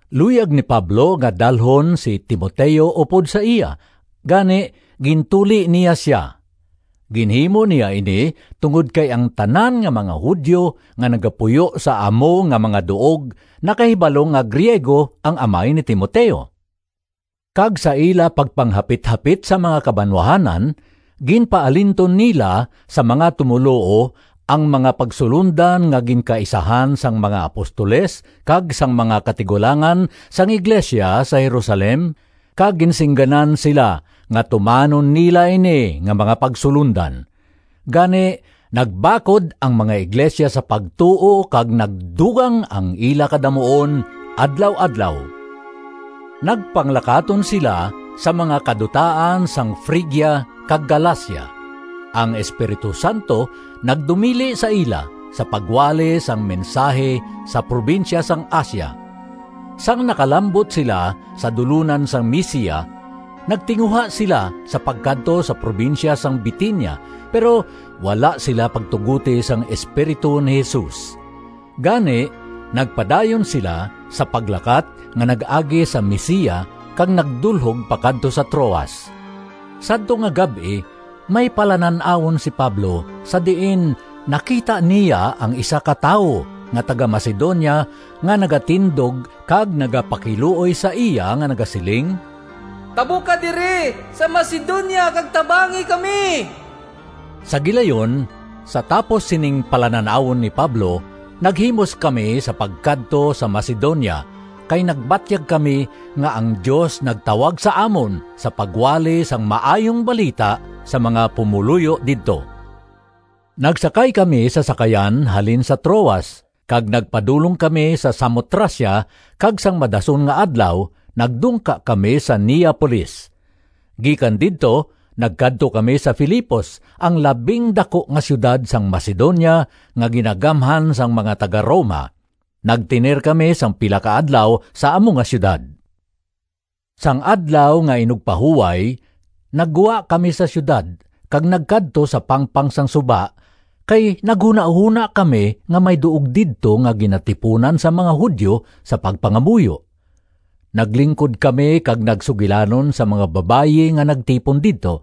Luyag ni Pablo nga dalhon si Timoteo upod sa iya, gani gintuli niya sia. Ginhimo niya ini tungod kay ang tanan nga mga Judio nga nagapuyo sa amo nga mga duog nakahibalo nga Griego ang amay ni Timoteo. Kag sa ila pagpanghapithapit sa mga kabanwahanan, ginpaalinton nila sa mga tumoluo ang mga pagsulondan nga ginkaisahan sang mga apostoles kag sang mga katigulangan sang iglesia sa Jerusalem, kag ginsingganan sila nga tumanon nila ini nga mga pagsulondan. Gani nagbakod ang mga iglesia sa pagtuo kag nagdugang ang ila kadamuon adlaw-adlaw. Nagpanglakaton sila sa mga kadutaan sang Frigia kag Galacia. Ang Espiritu Santo nagdumili sa ila sa pagwali sang mensahi sa probinsya sang Asia. Sang nakalambot sila sa dulonan sang Misia, nagtinguha sila sa pagkadto sa probinsya sang Bitinia, pero wala sila pagtugoti sang Espiritu ni Jesus. Gani nagpadayon sila sa paglakat nga nag-agi sa Misia kag nagdulhog pakadto sa Troas. Sadto nga gab-i may palanan-awon si Pablo sa diin nakita niya ang isa ka tawo nga taga-Macedonia nga nagatindog kag nagapakiluoy sa iya nga nagasiling, “Tabok ka diri sa Macedonia kag tabangi kami!” Sa gilayon, sa tapos sining palanan-awon ni Pablo, naghimos kami sa pagkadto sa Macedonia, kay nagbatyag kami nga ang Dios nagtawag sa amon sa pagwali sang Maayong Balita sa mga pumoluyo didto. Nagsakay kami sa sakayan halin sa Troas kag nagpadulong kami sa Samotracia, kag sang madason nga adlaw nagdungka kami sa Neapolis. Gikan didto nagkadto kami sa Filipos, ang labing daku nga siyudad sang Macedonia nga ginagamhan sang mga taga-Roma. Nagtener kami sing pila ka adlaw sa amo nga siyudad. Sang Adlaw nga Inugpahuway naggwa kami sa siyudad kag nagkadto sa pangpang sang suba kay naghunahona kami nga may duog didto nga ginatipunan sang mga Judio sa pagpangamuyo. Naglingkod kami kag nagsugilanon sa mga babayi nga nagtipon didto.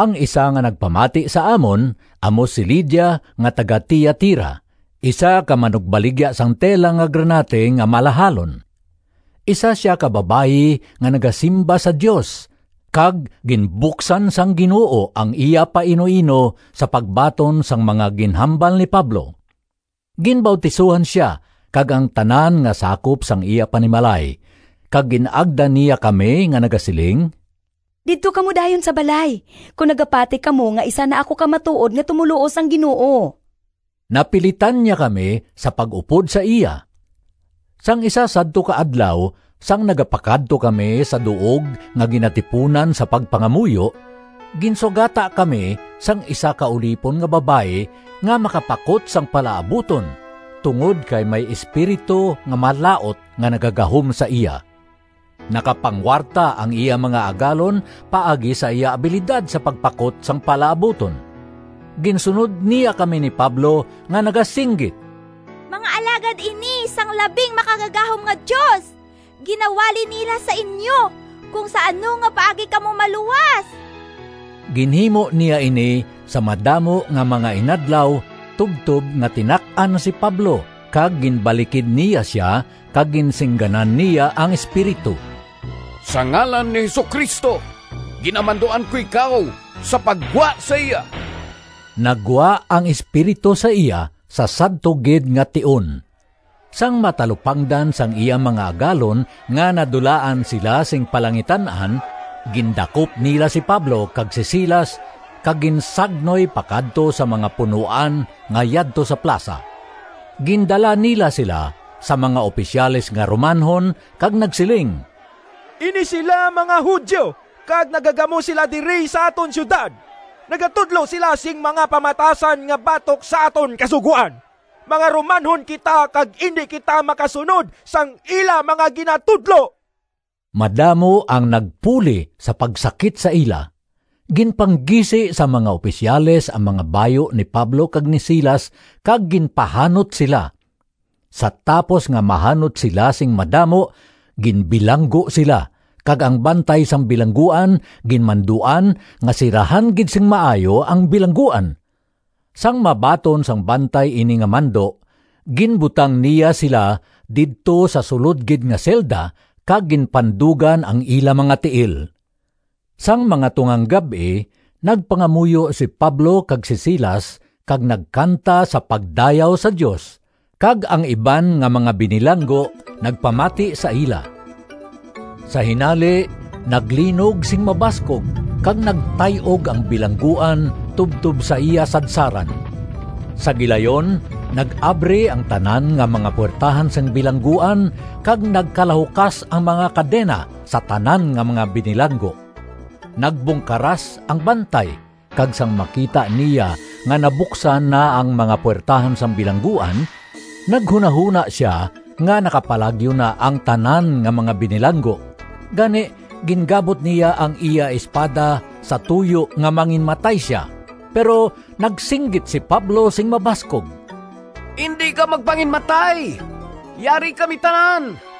Ang isa nga nagpamati sa amon amo si Lidia nga taga-Tiatira, isa ka manugbaligya sang tela nga granate nga malahalon. Isa sia ka babayi nga nagasimba sa Dios kag ginbuksan sang Ginoo ang iya painuino sa pagbaton sang mga ginhambal ni Pablo. Ginbautisohan sia kag ang tanan nga sakop sang iya panimalay. Kag gin-agda niya kami nga nagasiling, “Didto kamo dayon sa balay kon nagapati kamo nga isa na ako ka matuod nga tumoluo sang Ginoo.” Napilitan niya kami sa pag-upod sa iya. Sang isa sadto ka adlaw, sang nagapakadto kami sa duog nga ginatipunan sa pagpangamuyo, ginsugata kami sang isa ka ulipon nga babayi nga makapakot sang palaabuton tungod kay may espiritu nga malaut nga nagagahom sa iya. Nakapanguwarta ang iya mga agalon paagi sa iya abilidad sa pagpakot sang palaabuton. Ginsunod niya kami ni Pablo nga nagasinggit, “Mga alagad ini sang Labing Makagagahom nga Dios! Ginawali nila sa inyo kon sa ano nga paagi kamo maluwas!” Ginhimo niya ini sa madamo nga mga inadlaw tubtob nga tinak-an si Pablo kag ginbalikid niya sia, kag ginsingganan niya ang espiritu, “Sa ngalan ni Jesu-Cristo ginamanduan ko ikaw sa paggwa sa iya!” Naggwa ang espiritu sa iya sa sadto gid nga tion. Sang matalupangdan sang iya mga agalon nga nadulaan sila sing palangitan-an, gindakop nila si Pablo kag si Silas kag ginsagnoy pakadto sa mga punoan nga yadto sa plasa. Gindala nila sila sa mga opisyales nga Romanhon kag nagsiling, “Ini sila mga Judio kag nagagamo sila diri sa aton siyudad. Nagatudlo sila sing mga pamatasan nga batok sa aton kasugoan. Mga Romanhon kita kag indi kita makasunod sang ila mga ginatudlo!” Madamo ang nagpuli sa pagsakit sa ila. Ginpanggisi sang mga opisyales ang mga bayu ni Pablo kag ni Silas kag ginpahanot sila. Sa tapos nga mahanot sila sing madamo, ginbilanggo sila kag ang bantay sang bilangguan ginmanduan nga sirahan gid sing maayo ang bilangguan. Sang mabaton sang bantay ini nga mando, ginbutang niya sila didto sa sulod gid nga selda kag ginpandugan ang ila mga tiil. Sang mga tungang gab-i, nagpangamuyo si Pablo kag si Silas kag nagkanta sa pagdayaw sa Dios, kag ang iban nga mga binilanggo nagpamati sa ila. Sa hinali naglinog sing mabaskog kag nagtay-og ang bilangguan tubtob sa iya sadsaran. Sa gilayon nag-abri ang tanan nga mga puwertahan sang bilangguan kag nagkalahukas ang mga kadena sa tanan nga mga binilanggo. Nagbungkaras ang bantay, kag sang makita niya nga nabuksan na ang mga puwertahan sang bilangguan, naghunahona sia nga nakapalagyo na ang tanan nga mga binilanggo. Gani gingabot niya ang iya espada sa tuyo nga manginmatay sia. Pero nagsinggit si Pablo sing mabaskog, “Indi ka magpanginmatay! Yari kami tanan!”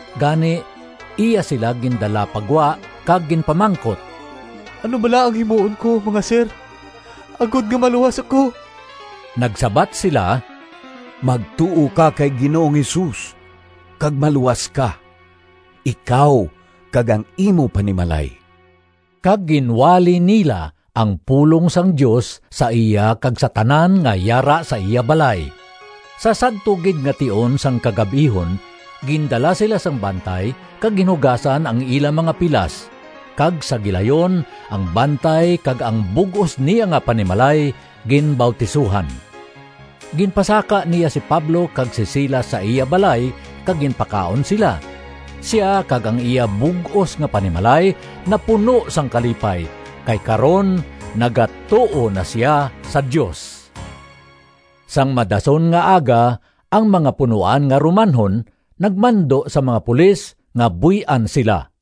Gani iya sila gindala pa gwa kag ginpamangkot, “Ano bala ang himuon ko, mga sir, agod nga maluwas ako?” Nagsabat sila, “Magtuo ka kay Ginoong Jesus kag maluwas ka, ikaw kag ang imo panimalay.” Kag ginwali nila ang pulong sang Dios sa iya kag sa tanan nga yara sa iya balay. Sa sadto gid nga tion sang kagab-ihon gindala sila sang bantay kag ginhugasan ang ila mga pilas kag sa gilayon ang bantay kag ang bug-os niya nga panimalay ginbautisohan. Ginpasaka niya si Pablo kag si Silas sa iya balay kag ginpakaon sila. Sia kag ang iya bug-os nga panimalay napuno sang kalipay kay karon nagatuo na sia sa Dios. Sang madason nga aga ang mga punoan nga Romanhon nagmando sa mga pulis nga buy-an sila.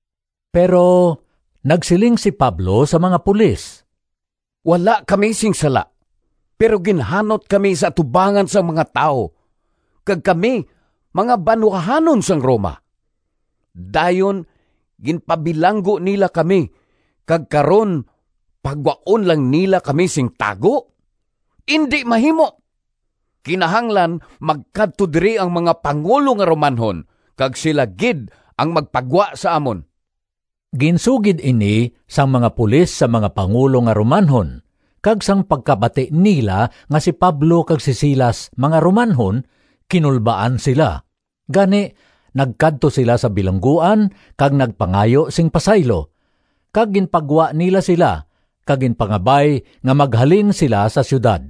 Pero nagsiling si Pablo sa mga pulis, “Wala kami sing sala, pero ginhanot kami sa atubangan sang mga tawo, kag kami mga banwahanon sang Roma! Dayon ginpabilanggo nila kami, kag karon pagwaon lang nila kami sing tago? Indi mahimo! Kinahanglan magkadto diri ang mga pangulo nga Romanhon kag sila gid ang magpagwa sa amon.” Ginsugid ini sang mga pulis sa mga pangulo nga Romanhon kag sang pagkabati nila nga si Pablo kag si Silas mga Romanhon, kinulbaan sila. Gani, nagkadto sila sa bilangguan kag nagpangayo sing pasaylo, kag ginpagwa nila sila kag ginpangabay nga maghalin sila sa siyudad.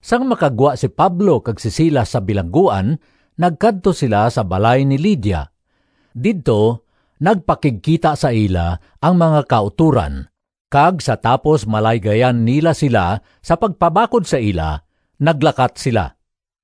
Sang makagwa si Pablo kag si Silas sa bilangguan nagkadto sila sa balay ni Lidia. Didto nagpakigkita sa ila ang mga kautoran kag sa tapos malaygayan nila sila sa pagpabakod sa ila, naglakat sila.